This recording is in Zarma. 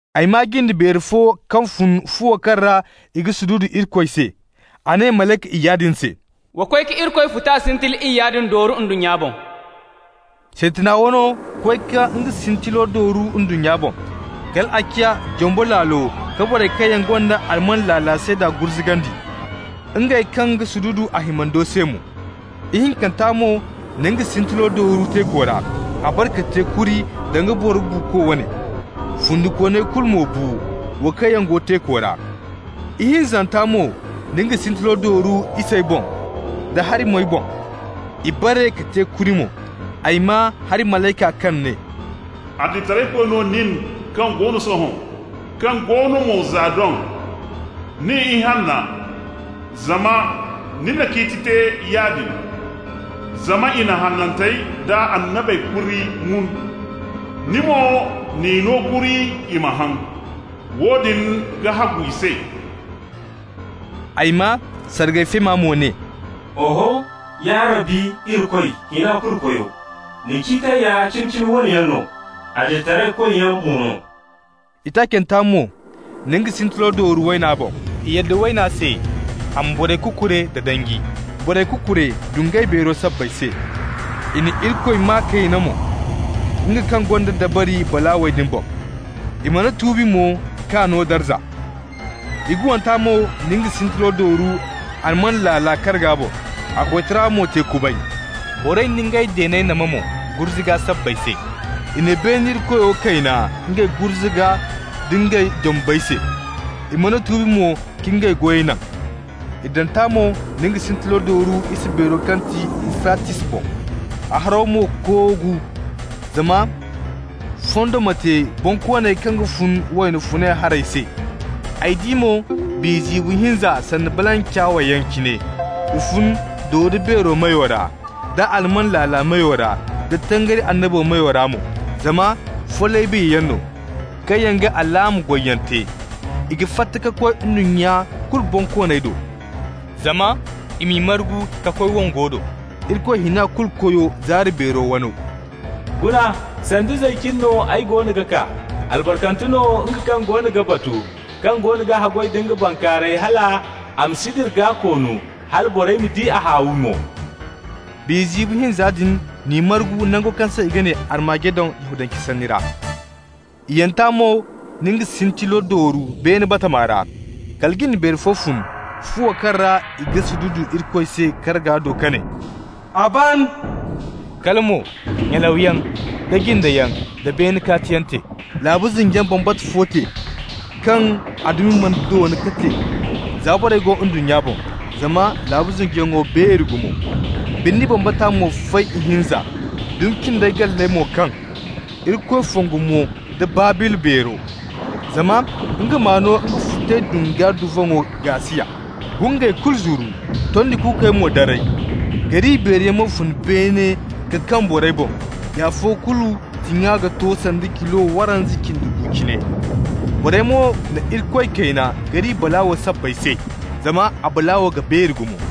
Ay maa jinde beeri fo kaŋ fun fuwo kaŋ ra i ga sududu Irikoy se. A ne malayka iyya din se: «Wa koy ka Irikoy futa sintili iyya din dooru ndunnya boŋ.» Sintina wano koy ka nga sintilo dooru ndunnya boŋ. Kal a ciya jombo laalo ka borey kaŋ yaŋ gonda alman laala seeda gurzugandi, ngey kaŋ ga sududu a himando se mo. Ihinkanta mo na nga sintilo dooru teeko ra. A bare ka te kuri danga boro buuko wane. Fundikooney kulu bu mo, wo kaŋ yaŋ go teeko ra. Ihinzanta mo na nga sintilo dooru isey boŋ da hari-moy boŋ. I bare ka te kuri mo. Ay maa hari malayka kaŋ ne: «Adilitaraykoy no nin kaŋ go no sohõ, kaŋ go no mo za doŋ, nin Ihanna, zama ni na ciiti te yaadin. Zama i na hanantey da annabey kuri mun, ni mo n'i no kuri i ma haŋ. Woodin ga hagu i se.» Ay maa sargay feema mo ne: «Oho, ya Rabbi Irikoy, Hina-Kulu-Koyo, ni ciitey ya cimi-cimi wane yaŋ no, adilitaraykoyyaŋ mo no.» Itaacanta mo na nga sintilo dooru wayna boŋ. I yadda wayna se a ma borey kukure da danji. Borey kukure dungay beero sabbay se. I na Irikoy maa kayna mo, nga kaŋ gonda dabari balaawey din boŋ. I mana tuubi mo k'a no darza. Iguwanta mo na nga sintilo dooru alman laala karga boŋ, a koytara mo te kubay. Borey na ngey deeney nama mo gurzuga sabbay se. I na beene Irikoyo kayna ngey gurzuga da ngey jombey se, i mana tuubi mo ka ngey goyey naŋ. Iddanta mo na nga sintilo dooru isa beero kaŋ ti Ufratis boŋ. A haro mo koogu zama fondo ma te bonkooney kaŋ ga fun wayna funay haray se. Ay di mo biya ziibo hinza sanda balancawyaŋ cine. I fun dodo-beero meyo ra, da alman laala meyo ra da tangari annabo meyo ra mo. Zama follay biyayaŋ no, kaŋ yaŋ ga alaama goyyaŋ te. I ga fatta ka koy ndunnya kulu bonkooney do, zama i m'i margu ka koy wongo do, Irikoy Hina-Kulu-Koyo zaari beero wano. (Guna, sanda zay cine no ay goono ga kaa. Albarkante no nga kaŋ goono ga batu, kaŋ goono ga haggoy da nga bankaarayey hal a ma si dira gaa-koonu, hala borey ma di a haawi mo.) Biya ziibo hinza din n'i margu nango kaŋ se i ga ne Ar-Magedon Yahudance sanni ra. Iyyanta mo na nga sintilo dooru beene batama ra. Kala jinde beeri fo fun fuwo kaŋ ra i ga sududu Irikoy se karga do ka ne: «A ban!» Kala mo nyalawyaŋ da jindeyaŋ da beene kaatiyaŋ te. Laabu zinjiyaŋ bambata fo te kaŋ a dumi mana doona ka te za borey go ndunnya boŋ, zama laabu zinjiyaŋo beeri gumo. Birni bambata mo fay ihinza, dumi cindey galley mo kaŋ. Irikoy fongu mo nda Babila beero, zama nga m'a no nga futay dunga duvaŋo gaasiya. Gungey kulu zuru, tondi kuukey mo daray. Gari beeri yaŋ mo fun beene ka kaŋ borey boŋ, i afo kulu tiŋa ga to sanda kilo waranza cindi gu cine. Borey mo na Irikoy kayna gari balaawo sabbay se, zama a balaawo ga beeri gumo.